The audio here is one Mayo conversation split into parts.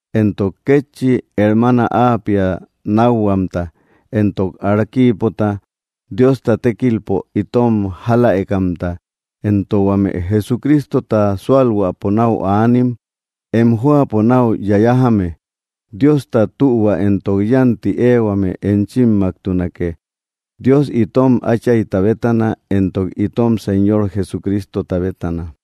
entok kétchi hermaana Apia nákhuamta, entok Arquipota, Diosta tékilpo itom jáläekamta, entok huame Jesucristota súalhuäpo náu aanim, em jóapo nau yayajame. Diosta tühua entok yánti éehuame enchimmaktunake, Dios itom Áchayta bétana entok itom Señor Jesucristota bétana.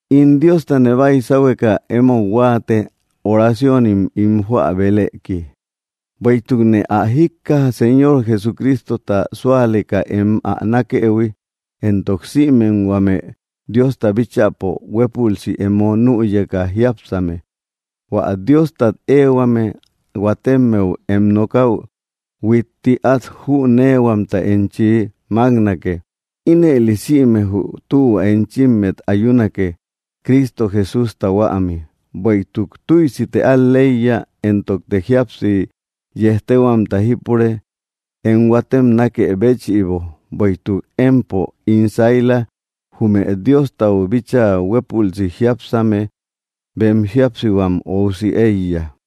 In Diostane baisahueka emou huáate, oraciónim ín joä beleki, bueïtukne ä jíkkaja, Señor Jesucristota súaleka em ä nákëhui, entok sïmem huame Diosta bíchäpo huélpülsi emo nüyeka jiápsame. Huä Diostat éehuame huatemmeu em nokäu, huitti át jüneehuamta enchi máknake; ínëli sïme jü tühua enchimmet ayunake, Cristo Jesústa huämi. Bueïtuk tüisite al‑leiya, entokte jíapsi yéjtehuamta jípure, em huatem nákë béchïbo; bueïtuk empo, ín saila, jume Diostau bíchaa huépülsi jiápsame bem jíapsihuam óusi éiya.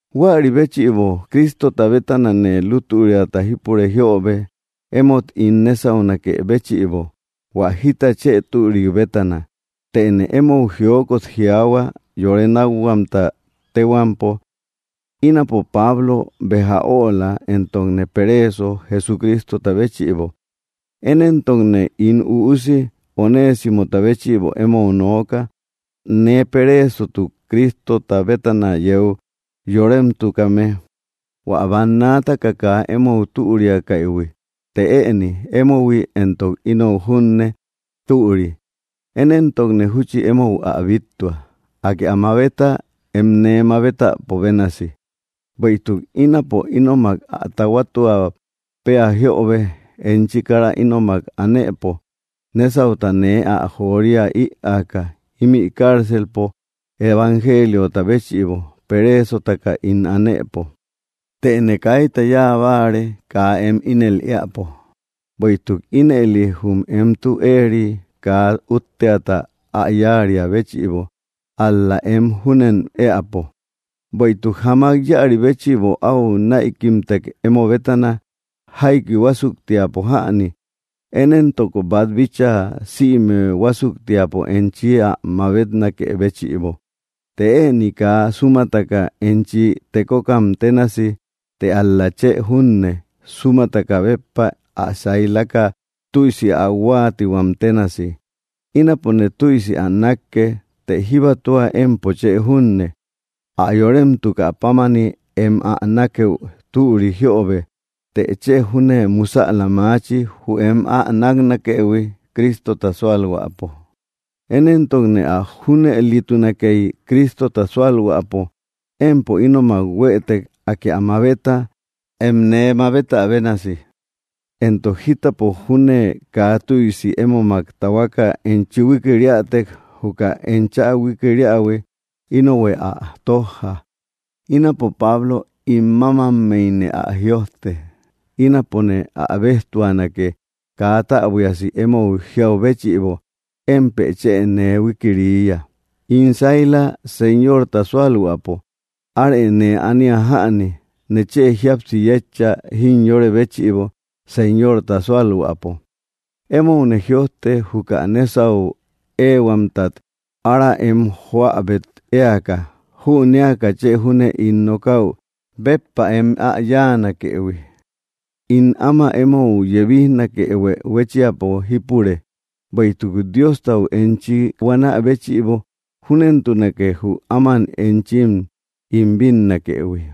Huäri béchïbo, Cristota bétanane lútüriata jípure jiöbe, emót ín nésaunakë béchïbo, hua jita chë türik bétana, tëne emou jiokot jiaahua, yore nákhuamta téhuampo: ínapo Pablo béja öla, entokne pereeso Jesucristota béchïbo. Én éntokne ín üusi Onésimota béchïbo emou nooka, nee pereesotuk Cristota bétana yeu yoremtukame. Huä bannaataka kaa emou türiakaïhui, të ëni emohui entok inou júne türi. Én éntokne júchi emou ä bíttua. Akë ä mabeta, em nee mabetäpo bénasi. Bueïtuk ínapo ínomak ä tahuatua péa jíöbe, enchi kara ínomak anëpo, nésauta nee ä joria ïaaka, ímï cárcelpo evangeliota béchïbo pereesotaka ín anëpo. Tëne kaita yáa báare kaa em ínel éäpo, bueïtuk ínëli jü em tü éeri kaa útteata ä yáariä béchïbo, ál‑la em júnen éäpo. Bueïtuk jamak íäri béchïbo au näikimtek emo bétana, jaiki huásuktiapo jäni, én éntok bát bíchaa sïme huásuktiapo enchi ä mabetnakë béchïbo, të ëni kaa súmataka enchi tekokam ténasi, të ál‑la chë junne, súmataka béppa, ä sailaka tüisi ä huáatia ténasi. Ínapone tüisi ä nákke, të jíbatua empo chë junne. Ä yoremtukä pámani, em ä nákëu türi jíöbe, të chë júne musäla maachi, jü em ä náknakëhui, Cristota súalhuäpo. Én éntok ä junëlitunakey, Cristota súalhuäpo empo ínomak huëtek, Akë ä mabeta, em nee mabetä bénasi. Entok jítäpo júne kaa tüisi émomak tahuaka enchi huikiriätek, juka enchä huikiriähui, ínohuë ä tójja. Ínapo Pablo ín mámammeyne ä jïojte: ínapone ä béjtuanake. Kaa täbuiasi emou jiau béchïbo, émpë chë nee huikiriiya. In saila Señorta súalhuäpo, arë nee ania jäni; nechë jíapsi yétcha, jimyore béchïbo, Señorta súalhuäpo. Emoune jïojte, juka nésau éehuamtat ára em joäbet éaka, jünéaka chë júne ín nokäu béppa em ä yáanakëhui. In áma emou yebijnakehuë huéchiapo jípure; bueïtuk Diostau enchim buanä béchïbo júnentunake, jü áman enchim ín bínnakëhui.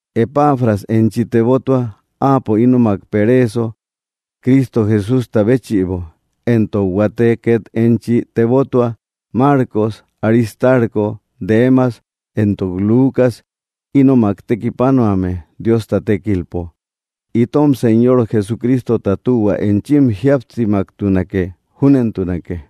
Epafras enchi tebottua; áapo ínomak pereeso Cristo Jesústa béchïbo. Entok huate két enchi tebottua: Marcos, Aristarco, Demas, entok Lucas, ínomak tekipanuame Diosta tékilpo. Itom Señor Jesucristota tühua enchim jíapsimaktunake. Júnentunake.